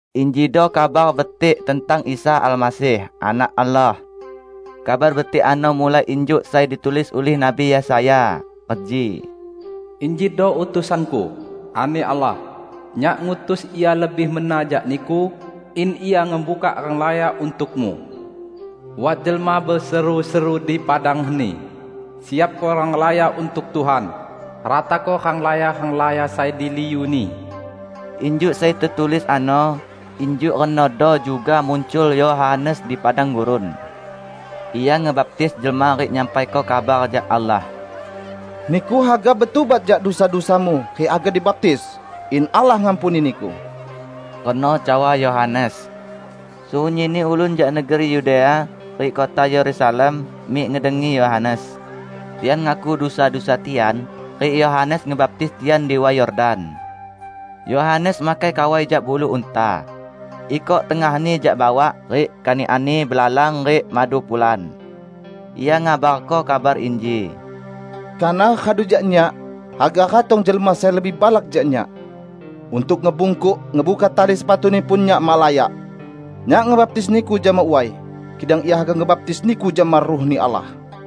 Injido Kabar Betik tentang Isa Almasih, Anak Allah. Kabar Betik ano mulai injuk sai ditulis ulih Nabi Yesaya, reji, " 'Injido utusan-Ku,' ani Allah; 'Nyak ngutus ia lebih mena jak Niku, in ia ngebukak renglaya untuk-Mu.' Wat jelma beseru-seru di padang heni, 'Siapko renglaya untuk Tuhan; ratako renglaya-renglaya sai diliu-Ni.' " Injuk sai tetulis ano, injuk renodo juga muncul Yohanes di padang gurun. Ia ngebaptis jelma rik nyampaiko kabar jak Allah. "Niku haga betubat jak dusa-dusamu rik haga dibaptis, in Allah ngampuni niku," reno cawa Yohanes. Sunyinni ulun jak negeri Yudea rik kota Yerusalem mik ngedengi Yohanes. Tian ngaku dusa-dusa tian, rik Yohanes ngebaptis tian di Way Yordan. Yohanes makai kawai jak bulu unta. Ikok tengahni jak bawak, rik kanikanni belalang rik madu pulan. Ia ngabarko kabar inji, "Kanah radu jak nyak, haga ratong jelma sai lebih balak jak nyak. Untuk ngebungkuk ngebuka tali sepatu-Ni pun, nyak mak layak. Nyak ngebaptis niku jama way, kidang Ia haga ngebaptis niku jama Ruh-Ni Allah."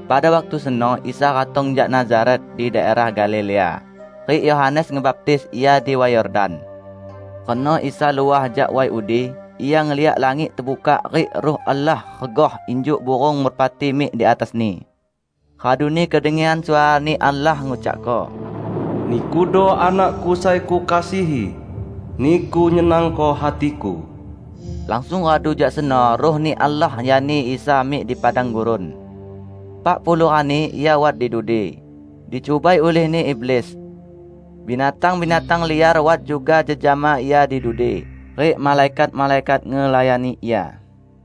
Pada waktu seno Isa ratong jak Nazaret di daerah Galilea, rik Yohanes ngebaptis Ia di Way Yordan. Reno Isa luah jak way udi, Ia ngeliak langit tebukak rik Ruh Allah regah injuk burung merpati mik di atas-Ni. Raduni kedengian suara-Ni Allah ngucakko, "Nikudo Anak-Ku sai Kukasihi. Niku nyenangko hati-Ku." Langsung radu jak seno Ruh-Ni Allah nyani Isa mik di padang gurun. Epak puluh rani Ia wat di dudi, dicubai ulihni iblis. Binatang-binatang liar wat juga jejama Ia di dudi, rik malaikat-malaikat ngelayani Ia.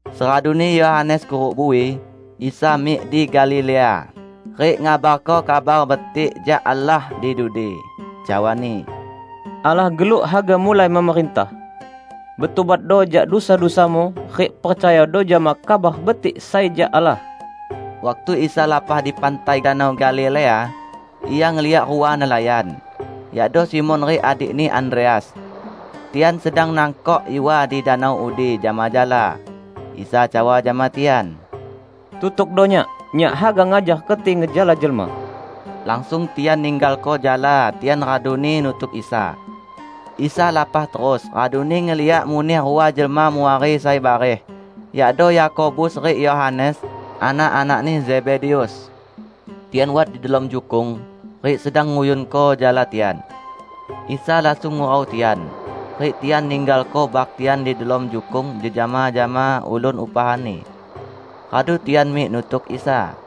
Seraduni Yohanes kuruk bui, Isa mik di Galilea, rik ngabarko Kabar Betik jak Allah di dudi. Cawa-Ni, "Allah geluk haga mulai memerintah. Betubatdo jak dusa-dusamu, rik percayado jama Kabar Betik sai jak Allah!" Waktu Isa lapah di pantai Danau Galilea, Ia ngeliak rua nelayan, yakdo Simon rik adikni Andreas. Tian sedang nangkok iwa di danau udi jama jala. Isa cawa jama tian, "Tutukdo Nyak. Nyak haga ngajar keti ngejala jelma." Langsung tian ninggalko jala tian raduni nutuk Isa. Isa lapah terus, raduni ngeliak muneh rua jelma muari sai bareh, yakdo Yakobus rik Yohanes, anak-anakni Zebedeus. Tian wat di delom jukung, rik sedang nguyunko jala tian. Isa langsung ngurau tian. Rik tian ninggalko bak tian di delom jukung jejama jama ulun upahanni. Radu tian mik nutuk Isa.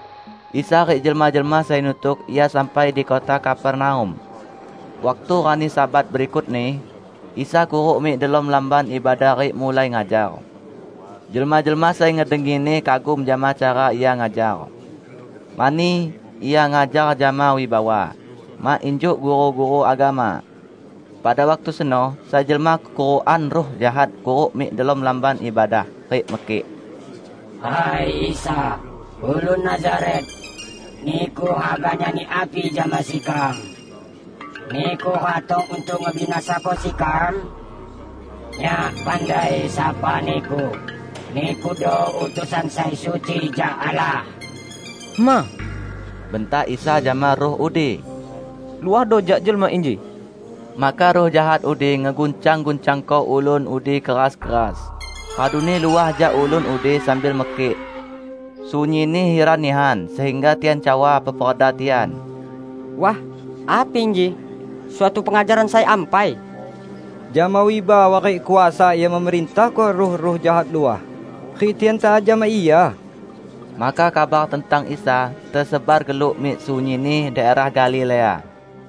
Isa rik jelma-jelma sai nutuk Ia sampai di kota Kapernaum. Waktu rani Sabat berikutni, Isa kuruk mik delom lamban ibadah rik mulai ngajar. Jelma-jelma sai ngedengi-Ni kagum jama cara Ia ngajar. Mani, Ia ngajar jama wibawa, mak injuk guru-guru agama. Pada waktu seno sai jelma kekurukan ruh jahat kuruk mik delom lamban ibadah, rik mekik, "Hai Isa, ulun Nazaret, Niku haga nyani api jama sekam? Niku ratong untuk ngebinasako sekam? Nyak pandai sapa Niku: Nikudo utusan sai suci jak Allah!" "Hema!" bentak Isa jama ruh udi, "luahdo jak jelma inji!" Maka ruh jahat udi ngeguncang-guncangko ulun udi keras-keras, raduni luah jak ulun udi sambil mekik. Sunyinni hiran nihan, sehingga tian cawa peperda tian, "Wah, api inji? Suatu pengajaran sai ampai! Jama wibawa rik kuasa Ia memerintahko ruh-ruh jahat luah, rik tian taat jama Ia!" Maka kabar tentang Isa tesebar geluk mik sunyinni daerah Galilea.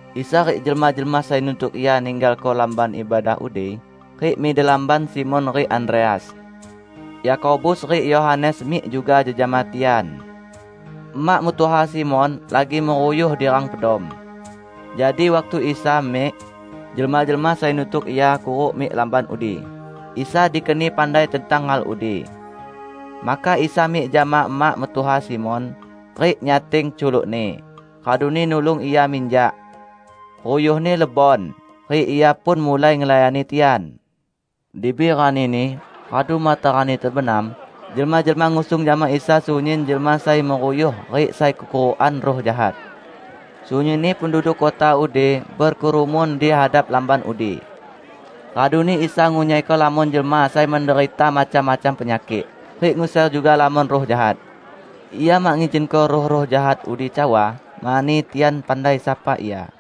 Isa rik jelma-jelma sai nutuk Ia ninggalko lamban ibadah udi, rik mik di lamban Simon rik Andreas. Yakobus rik Yohanes mik juga jejama tian. Emak mentuha Simon lagi meruyuh di rang pedom. Jadi waktu Isa mik, jelma-jelma sai nutuk Ia kuruk mik lamban udi, Isa dikeni pandai tentang hal udi. Maka Isa mik jama emak mentuha Simon, rik nyating culukni, raduni nulung ia minjak. Ruyuhni lebon, rik ia pun mulai ngelayani tian. Dibi ranini, radu matarani tebenam, jelma-jelma ngusung jama Isa sunyin jelma sai meruyuh rik sai kekurukan ruh jahat. Sunyinni penduduk kota udi bekerumun di hadap lamban udi. Raduni Isa ngunyaiko lamon jelma sai menderita macam-macam penyakik, rik nguser juga lamon ruh jahat. Ia mak ngizinko ruh-ruh jahat udi cawa, mani tian pandai sapa Ia.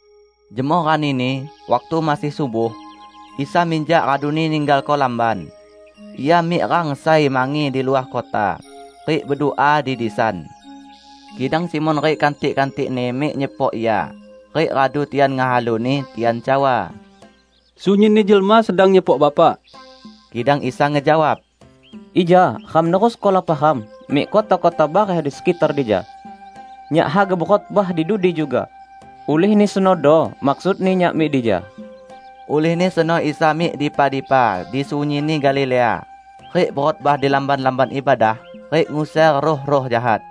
Jemoh ranini, waktu masih subuh, Isa minjak raduni ninggalko lamban. Ia mik rang sai mangi di luah kota, rik bedua di disan. Kidang Simon rik kantik-kantikni mik nyepok Ia. Rik radu tian ngehalu-Ni, tian cawa, "Sunyinni jelma sedang nyepok Bapak." Kidang Isa ngejawab, "Ija ram nerusko lapah ram mik kota-kota bareh di sekitar dija. Nyak haga bekhotbah di dudi juga, ulihni senodo maksudni Nyak mik dija." Ulihni seno Isa mik dipa-dipa di sunyinni Galilea, rik bekhotbah di lamban-lamban ibadah rik nguser ruh-ruh jahat.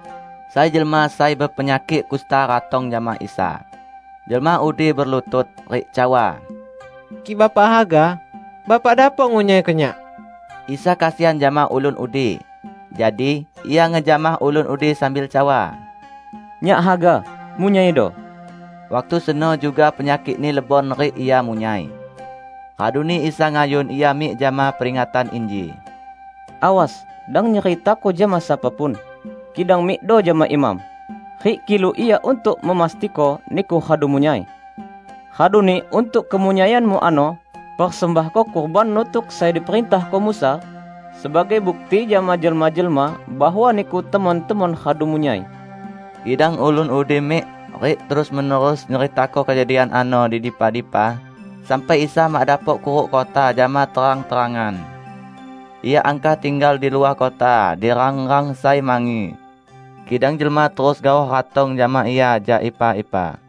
Sai jelma sai bepenyakik kusta ratong jama Isa. Jelma udi belutut, rik cawa, "Kik Bapak haga, Bapak dapok ngunyaiko nyak." Isa kesian jama ulun udi. Jadi, Ia ngejamah ulun udi sambil cawa, "Nyak haga, munyaido!" Waktu seno juga penyakikni lebon rik ia munyai. Raduni Isa ngayun ia mik jama peringatan inji, "Awas, dang nyeritako jama sapa pun, kidang mikdo jama imam, rik kilu ia untuk memastiko niku radu munyai. Raduni untuk kemunyaianmu ano, persembahko kurban nutuk sai diperintahko Musa, sebagai bukti jama jelma-jelma bahwa niku temon-temon radu munyai." Kidang ulun udi mik, rik terus-menerus nyeritako kejadian ano di dipa-dipa sampai Isa mak dapok kuruk kota jama terang-terangan. Ia angkah tinggal di luah kota di rang-rang sai mangi. Kidang jelma terus gaoh ratong jama Ia jak ipa-ipa.